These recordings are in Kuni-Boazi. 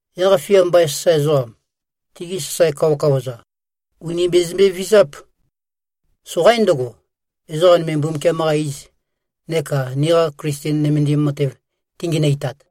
Yaq-fia mbain sasae ezoqam, tigi sasae kawakawa-za, ùni bezømbe-vizáp. Soqaín ndøgo, ezoqa nøme Mbumbukiam-qa iz neka niqa Klisten nømendim matev tingenøitat.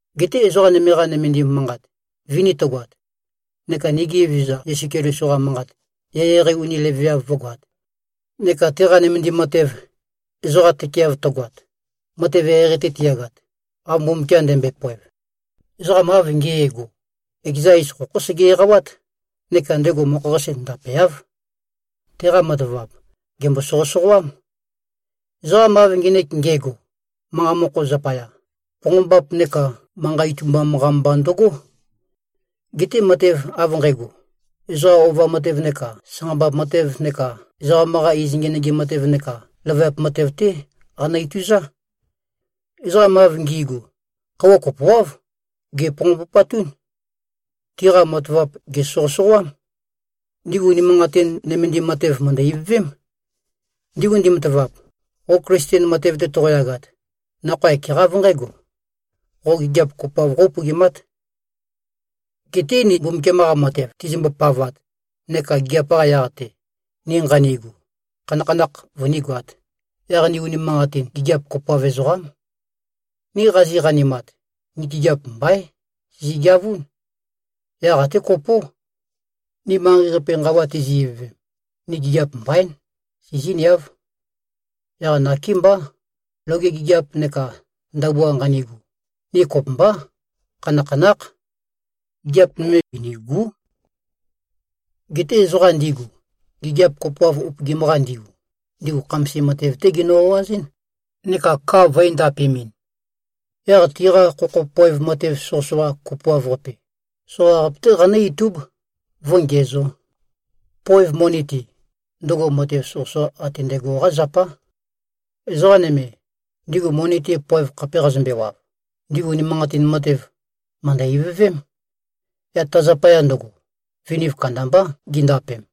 Geté ezoqa nøme-qa nømendim manqat vini tøgoat neka nigi Evezøza Yesu Keliso-qa manqat eqeieqei uni leveav vǿgoāt, neka teqa nømendim matev, ezoqa tøkeeav tøgoat, matev eqeieqei-te tiyagat, av Mbumbukiam ndømbøe-poev, ezoqam av nge꞉go, ekeza iz khokhó sege-eqawát neka ndego mokho-qase ndapeáv. Teqa matavap, gèmbo-soqøsoqoám. Ezoqam av ngenek nge꞉go, manqa mokho zapaya, ponqombap neka manqa itumbam-qa mba ndøgó. Geté matev av nqægo, ezoqa ova matev neka sanqambap matev neka ezoqam-qa iz ngenøgim matev neka løvøyap matev-té qanø-ituzá. Ezoqam av ngi꞉gu, khøuwa kopoáv, gèponqombupatún. Tiqa matavap gèsoqøsoqoám. Ndigu unimanqatin nømendim matev, mø̀ndø-ivøvém. Ndigu ndimatavap, qo Klisten matev-te toqoyagat, nakhoa ekeqá av nqǽgo: Qo gigiap kopoav qó-upøgimát. Geté ni Mbumbukiam-qa matev tizimbo-pavat neka gigiap-qa yaq-te, ni nqanigu, khanakhanakh vønígoāt, yaq ni unimanqatin gigiap kopoav ezoqám. Ni qazi-qanimat, ni gigiap mbaín, sizi-geavún. Yaq até kopó. Ni manqei-qape nqawa tizi-ivøvem, ni gigiap mbaín, sizíniáv. Yaq nakémbá, loge gigiap neka ndabua nqanigu, ni kopømbá, khanakhanákh. Gigiap nøme binìgu᷄. Geté ezoqa ndigu, gigiap kopoav upøgim-qa ndigu, ndigu khamasim matev-té ginø-o꞉azɨ́n, neka ka vø̄endapemɨn. Yaq tiqa khokho poev matev soqøsoqa kopoav-qape, soqaqape-té qanǿ-itúb, vǿngiæzō. Poev moni-te, ndøgo matev soqøsoqa ate ndægo-qá zapá. Ezoqa nøme, ndigu moni-te poev khape qazømbewav, ndigu unimanqatin matev, mø̀ndø-ivøvém. Yaq ta zapaya ndøgo, viniv kandambá gindapem.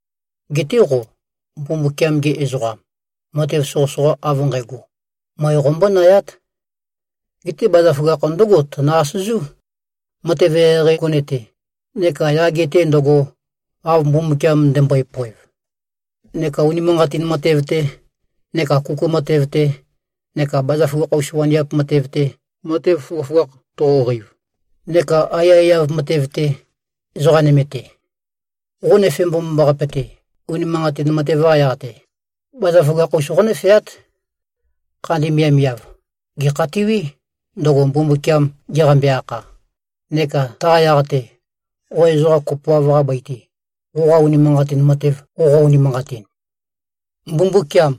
Geté qo, Mbumbukiam-ge ezoqam, matev soqøsoqa av nqægo, møe qombónayát. Geté bazaføgakh ndǿgo tønø-asøzú: Matev eqeieqei gone-te, neka yage-te ndøgo, av Mbumbukiam ndømbøe-poev, neka unimanqatin matev-te, neka kuku matev-te, neka bazaføgakh-us waniap matev-te, matev føgøføgakh toqoqeiv, neka aiyaiyav matev-te, ezoqa nøme-te. Qo nøfe mbomambaqape-te, unimanqatin matev-qa yaq-te, bazaføgakh-us qónøfeát. Khandi miavmiav, gèkhatiwí, ndøgo Mbumbukiam geqambe-akha, neka taqa yaq-te, qo ezoqa kopoav-qa bøi-te, qoqa unimanqatin matev qoqo-unimanqatin. Mbumbukiam,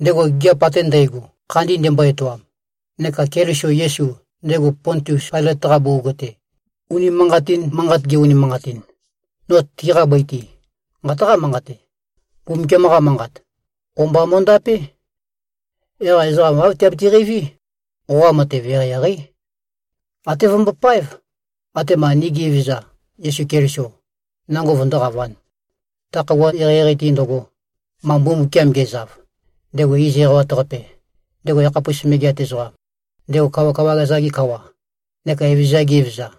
ndego gigiap ate ndægo, khandi ndembo-etoam, neka Keliso Yesu, ndego Pontius Pailøt-qa bugug-te, unimanqatin manqat ge-unimanqatin, no tiqa bøi-te, nqataqá-manqate: Mbumbukiam-qa Manqat, o-mba mo꞉ndapé. Yaq ezoqa āv tiabiti-qeiví, qoqa matev eqeieqeí. Até vømbopáev, atema nigi Evezøza Yesu Keliso nango vøndóqavān, ta khøuwa eqeieqei-te ndøgo, ma Mbumbukiam ge꞉zav, ndego iz eqawat-qape, ndego yakhapus megeat ezoqam, ndego kawakawa-za-ge Kawa neka evezøza-za-ge Evezøza.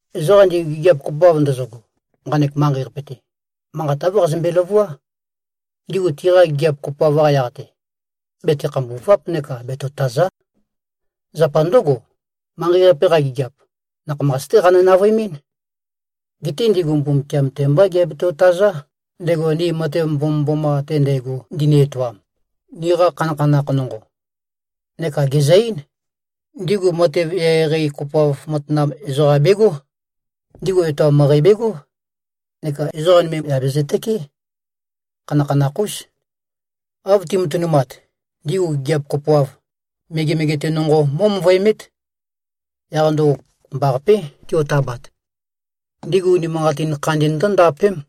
Ezoqam ndigu gigiap kopoav ndøzøgo, nqanek manqei-qape-te, manqat āv qazømbe-løvuá: Ndigu tiqa gigiap kopoav-qa yaq-te, bete-khambùva᷄p neka betotàza᷄. Zapa ndǿgo, manqei-qape-qa gigiap, nakhamas-té qanø-navøemɨ́n. Geté ndigu Mbumbukiam-te mbá giabeto-tazá, ndego ni matev mbomømboma ate ndægo ndini-etoam, niqa khanakhanakh nonqo. Neka gezø-eín: Ndigu matev eqeieqei kopoav matanam ezoqam begó. Ndigu etoam møqæ begó, neka ezoqa nøme yà bezøtøkeé. Khanakhanakh-ús. Av ti꞉matønumat, ndigu gigiap kopoav, megemege-te nonqo mó꞉møvøemét. Yaq ndøgo kopømbaqapé tiotabat. Ndigu unimanqatin khandi ndǿndapém.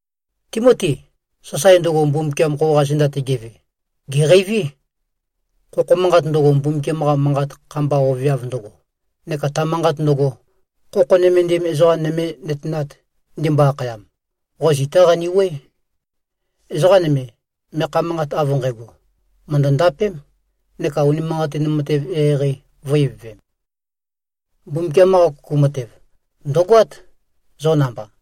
Timoti! Sasae ndøgo, Mbumbukiam qoqa zenda-te geve, gèqeiví. Khokho manqat ndøgo, Mbumbukiam-qa Manqat kha-mba oveav ndøgo, neka ta manqat ndøgo, khokho nømendim ezoqa nøme ‘nøtenat’ ndimbo-akhayam, qo zitá qanewuøé. Ezoqa nøme, meakha manqat av nqægo, mø̀ndø-ndapém, neka unimanqatin matev eqeieqei vø̄-ivøvem. Mbumbukiam-qa kuku matev, ndø̀goát, zo namba.